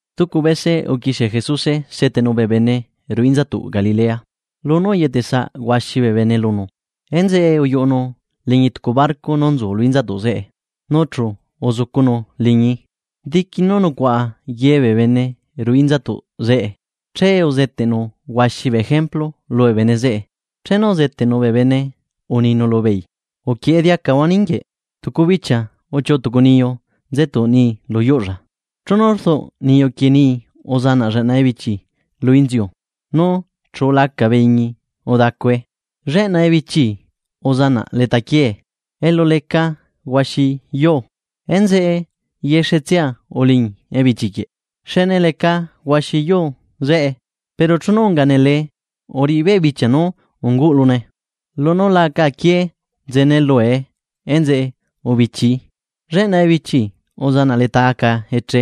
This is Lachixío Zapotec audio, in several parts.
Stucu bese uquixie Jesuse seteꞌnu bee bene ruꞌu inzatuꞌ Galilea. Lunú uyetesaꞌ huaxi bee bene lunu, enzeꞌe uyuꞌunu liñi tucu barco nú nzu lu inzatuꞌ zeꞌe, nu chu uzucunu liñii, diqui nú nucuaꞌa ye bee bene ruꞌu inzatuꞌ zeꞌe. Che uzeteꞌnu huaxi bee ejemplu lubee bene zeꞌe. Chenu uzeteꞌnu bee bene uninu lubeei: ―Uquieꞌe diacahua ninguieꞌ. Tucu bichia uchiuꞌu tucu niyu nzetuꞌ nii lu yuꞌlla. Chenu rduꞌ niyu quieꞌ nii uzanaꞌ lleꞌna ebichi lu inziu nu chu ulaca bee iñi udacue. Lleꞌna ebichi uzanaꞌ leta quiee, elu leca huaxi yuu. Enzeꞌe yexetsia uliñi ebichi quieꞌ xne leca huaxi yuu zeꞌe. Pero chenu unga nelee uriꞌi beꞌ bichia nú unguꞌlune. Lunú la aca aquié nzene lue enzeꞌe ubichii. Lleꞌna ebichi uzanaꞌ leta aca eche,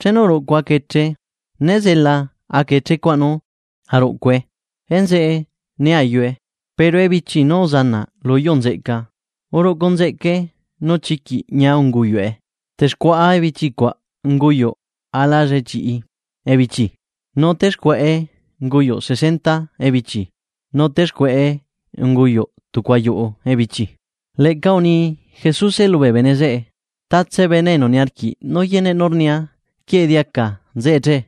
chenu uruꞌcu aca eche. Nézela aca eche cuaꞌ nú aruꞌcue enzeꞌe né ayue. Pero ebichi nú uzanaꞌ lu yuu nzeꞌca, uruꞌcu nzeꞌcae nu chiquiꞌ ñia unguyuꞌe. Texcuaꞌa bee ebichi cuaꞌ unguyuꞌ ala llichiꞌi ebichi nu texcuaꞌe unguyuꞌ sesenta ebichi nu texcuaꞌe unguyuꞌ tucu ayuꞌu ebichi. Leꞌca uni Jesuse lubee bene zeꞌe: ―Tatse bene enu niarquiꞌ nú yeneꞌ nú rnia quieꞌe diaca nzeꞌe che.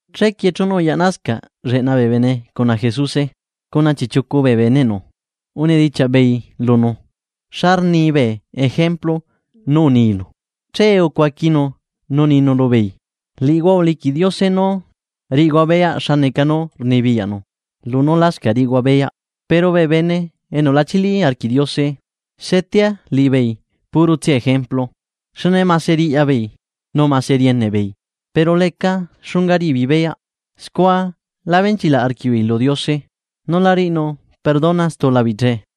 Chequie chenu uyaꞌnasca lleꞌna bee bene cuna Jesuse cuna chiꞌchiucu bee beneꞌnu, unidichiaꞌ beei lunu: ―Xa rni bee ejemplu nú uninu. Che ucuaquinu nu uninu lubeei: ―Liꞌihua uliquiꞌ Diose nú riꞌihua beyaꞌ xa neca nu rnibiyaꞌnu lunú lascaꞌ riꞌihua beyaꞌ. Pero bee bene enu la chili arquiꞌ Diose, setea liꞌibeei puro tsia ejemplu. Xne mase riꞌya beei, nu mase rieneꞌ beei. Pero leca xunga riꞌi beei beyaꞌ. Scua la benchilaꞌ arquiꞌbeei lu Diose, nu la riꞌinu perdona stula beei che.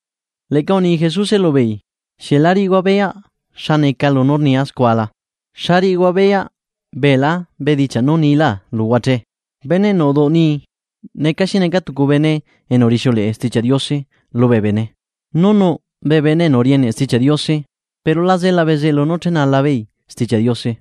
Leꞌca uni Jesuse lubeei: ―¿Xieꞌ la riꞌihua beyaꞌ xa neca lunú rnia scua la? ¿Xa riꞌihua beyaꞌ beela bedichiaꞌ nú niilá luhua che? Bene enu uduꞌu nii neca xi neca tucu bene enu rixiuleꞌe Stichiaꞌ Diose lubee bene, nu nuꞌ bee bene enu rieneꞌ Stichiaꞌ Diose, pero la zela bezeꞌlu nú chenala beei Stichiaꞌ Diose.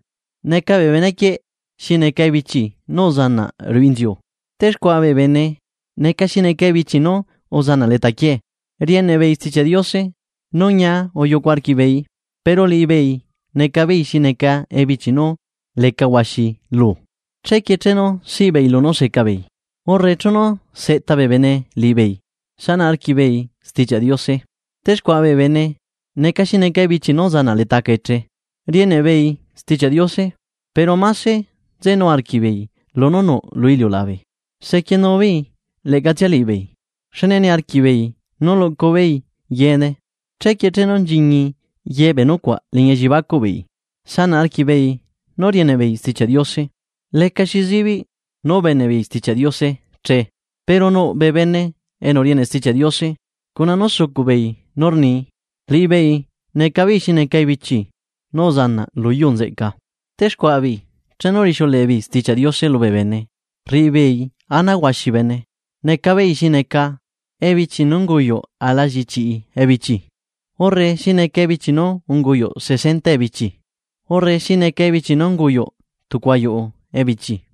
Neca bee bene quieꞌ xi neca ebichi nú uzanaꞌ ruꞌu inziu. Texcuaꞌa bee bene neca xi neca ebichi nú uzanaꞌ leta quiee. Rieneꞌ beei Stichiaꞌ Diose nu ñia uyucu arquiꞌbeei. Pero liꞌibeei neca beei xi neca ebichi nú leca huaxi luu. Chequie chenu siꞌi beei lunú seca beei, urre chenu seꞌta bee bene liꞌibeei sanaꞌ arquiꞌbeei Stichiaꞌ Diose. Texcuaꞌa bee bene neca xi neca ebichi nú uzanaꞌ leta aca eche, rieneꞌ beei Stichiaꞌ Diose. Pero máse nzenu arquiꞌbeei lunú nuꞌ lu iliulabe. Sequienu beei leꞌcatsia liꞌibeei, xne niarquiꞌ beei nú luꞌcu beei yeene. Chequie chenu nchiñi ye bee nucuaꞌ elliebacuꞌ beei, sanaꞌ arquiꞌ beei nú rieneꞌ beei Stichiaꞌ Diose. Lecaxi zibiꞌ nú ubeneꞌ beei Stichiaꞌ Diose che. Pero nuꞌ bee bene enu rieneꞌ Stichiaꞌ Diose, cuna nú sucuꞌ beei nú rnii, liꞌibeei neca beei xi neca ebichi nú uzanaꞌ lu yuu nzeꞌca. Texcuaꞌa beei chenu rixiuleꞌe beei Stichiaꞌ Diose lubee bene rriꞌi beei ana huaxi bee bene. Neca beei xi neca ebichi nú unguyuꞌ ala llichiꞌi ebichi urre xi neca ebichi nú unguyuꞌ sesenta ebichi urre xi neca ebichi nú unguyuꞌ tucu ayuꞌu ebichi.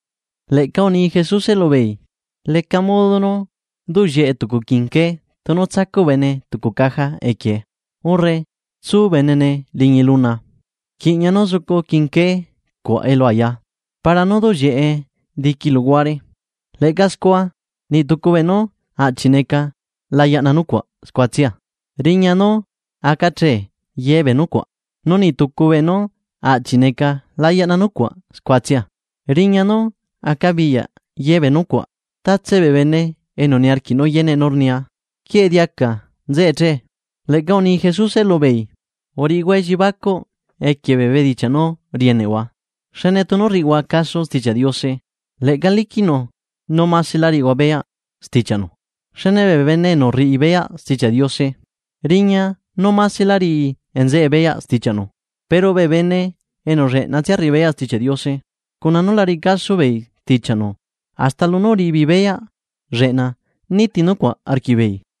Leꞌca uni Jesuse lubeei: ―¿Leca modo nú duꞌ llieꞌe tucu quinqué, tunu tsacuꞌ bene tucu caja equiee, urre tsu benene liñi luna? Rquiꞌña, nú zucu quinqué cuaꞌ elu ayaa, para nú duꞌ llieꞌe diqui luhuare. Leꞌca scua, niꞌ tucu beenú aꞌchi neca la yaꞌna nucuaꞌ scuatsia riña nú aca che ye bee nucuaꞌ, nu niꞌ tucu beenú aꞌchiꞌ neca la yaꞌna nucuaꞌ scuatsia riña nú acabiyaꞌ ye bee nucuaꞌ. Tatse bee bene enu niarquiꞌ nú yeneꞌ nú rnia quieꞌe diaca nzeꞌe che. Leꞌca uni Jesuse lubeei: ―Uriꞌihua elliebacuꞌ equie bee bedichiaꞌ nú rieneꞌhua. Xne tunu rriꞌihua caso Stichiaꞌ Diose. Leꞌca liquiꞌnu nú maselá riꞌihua beyaꞌ stichiaꞌnu. Xne bee bene enu rriꞌi beyaꞌ Stichiaꞌ Diose riña nú maselá riꞌi nzeꞌe beyaꞌ stichiaꞌnu pero bee bene enu lleꞌnatsia rriꞌi beyaꞌ Stichiaꞌ Diose, cuna nu la riꞌi caso beei stichiaꞌnu. Hasta lunú uriꞌi beei beyaꞌ lleꞌna niti nucuaꞌ arquiꞌbeei.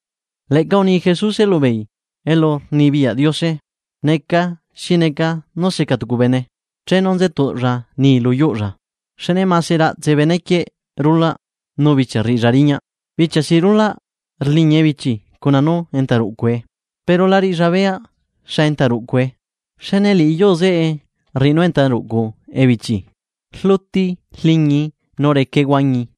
Leꞌca uni Jesuse lubeei: ―Elurnibiyaꞌ Diose, neca xi neca nú secaa tucu bene chenu nze tuꞌlla nii lu yuꞌulla. Xne mase raꞌtse bene quieꞌ rulaꞌ nu bichia rriꞌilla riñaꞌ. Bichia si rulaꞌ rliñi ebichi cuna nú enta ruꞌcue, pero la riꞌilla beyaꞌ xa enta ruꞌcue. Xne liꞌi yuu zeꞌe rriꞌi nu enta ruꞌcu ebichi, rluti rliñii nu recae huañi,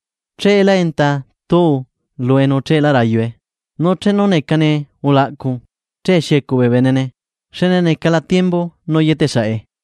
cheelá enta tuu lue nu cheelá rayue. Nu chenu necane ulaꞌcu, che xiecuꞌ bee benene xne necala tiembu nú yeteꞌ saꞌe.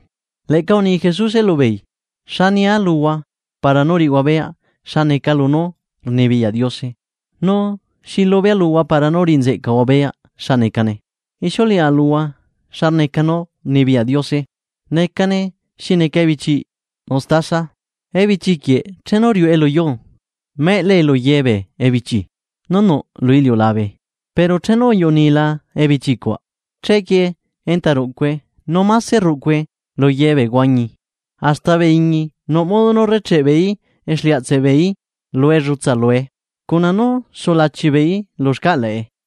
Leꞌca uni Jesuse lubeei: ―¿Xa nia luhua para nú riꞌihua beyaꞌ xa neca lunú rnibiyaꞌ Diose? ¿Nu xi lubea luhua para nú riꞌi nzeꞌcahua beyaꞌ xa necane? Ixiuleꞌa luhua xa neca nú rnibiyaꞌ Diose. Necane xi neca ebichiꞌ mestaza. Ebichi quieꞌ chenu riuꞌe lu yuu, meꞌelae lu ye bee ebichi nú nuꞌ lu iliulabe. Pero chenu uyuꞌu niila ebichi cuaꞌ, chequie enta ruꞌcue nu máse rruꞌcue lu ye bee huañi hasta bee iñi nuꞌ modo nú rrecheꞌe beeí exliaꞌtseꞌ beeí lu ellutsa lue cuna nú sulachi beeí lu xcaꞌlaꞌe.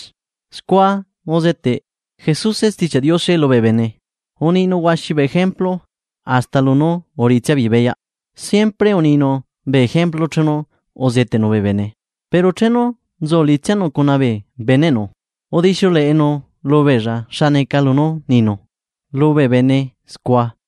Scua uzeteꞌ Jesuse Stichiaꞌ Diose lubee bene. Uninu huaxi bee ejemplu, hasta lunú uriꞌitsia beei beyaꞌ. Siempre uninu bee ejemplu chenu uzeteꞌnu bee bene. Pero chenu nzu liꞌitsianu cuna bee beneꞌnu udixiuleꞌenu lubeella xa neca lunú uninu lubee bene scua.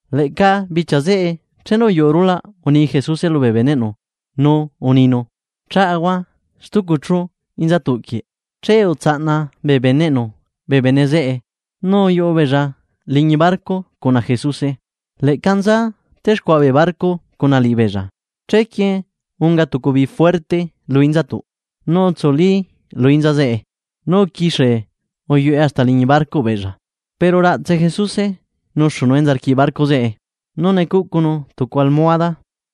Leꞌca bichia zeꞌe chenu uyuꞌu rulaꞌ uni Jesuse lubee beneꞌnu nu uninu: ―Chaꞌahua stucu chu inzatuꞌquieꞌ. Che utsaꞌna bee beneꞌnu bee bene zeꞌe nu uyuꞌu beella liñi barco cuna Jesuse. Leꞌca nza texcuaꞌa bee barco cuna liꞌibeella. Chequie unga tucu bii juerte lu inzatuꞌ nu utsuli lu inza zeꞌe nu uquixie uyuꞌe hasta liñi barcoꞌ beella. Pero raꞌtse Jesuse nuxunu enza rquiꞌ barco zeꞌe nu necuꞌcunu tucu almohada.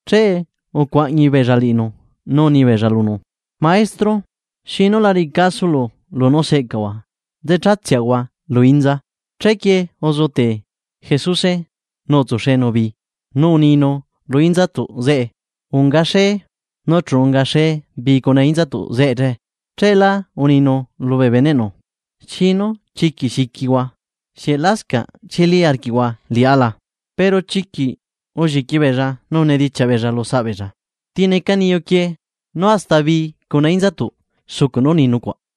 Che ucuaꞌñi beella liꞌinu nu uni beella lunu: ―¡Maestro! ¿Xinu la riꞌi casolo lunú seꞌcaꞌahua nzee chatseꞌahua lu inza? Chequie uzetee Jesuse nu utsuxenu bii, nu uninu lu inzatuꞌ zeꞌe: ―¡Aca xee! Nu chu unga xee bii cuna inzatuꞌ zeꞌe. Cheelá uninu lubee beneꞌnu: ―¿Xinu chiquiꞌ xiquihua? ¿Xieꞌlascaꞌ chili arquiꞌhua liꞌá la? Pero chiquiꞌ ulliqui beella nu unidichiaꞌ beella lusaꞌ beella: ―¿Ti neca niyu quieꞌ nú hasta bii cuna inzatuꞌ sucuꞌ nú rni nucuaꞌ?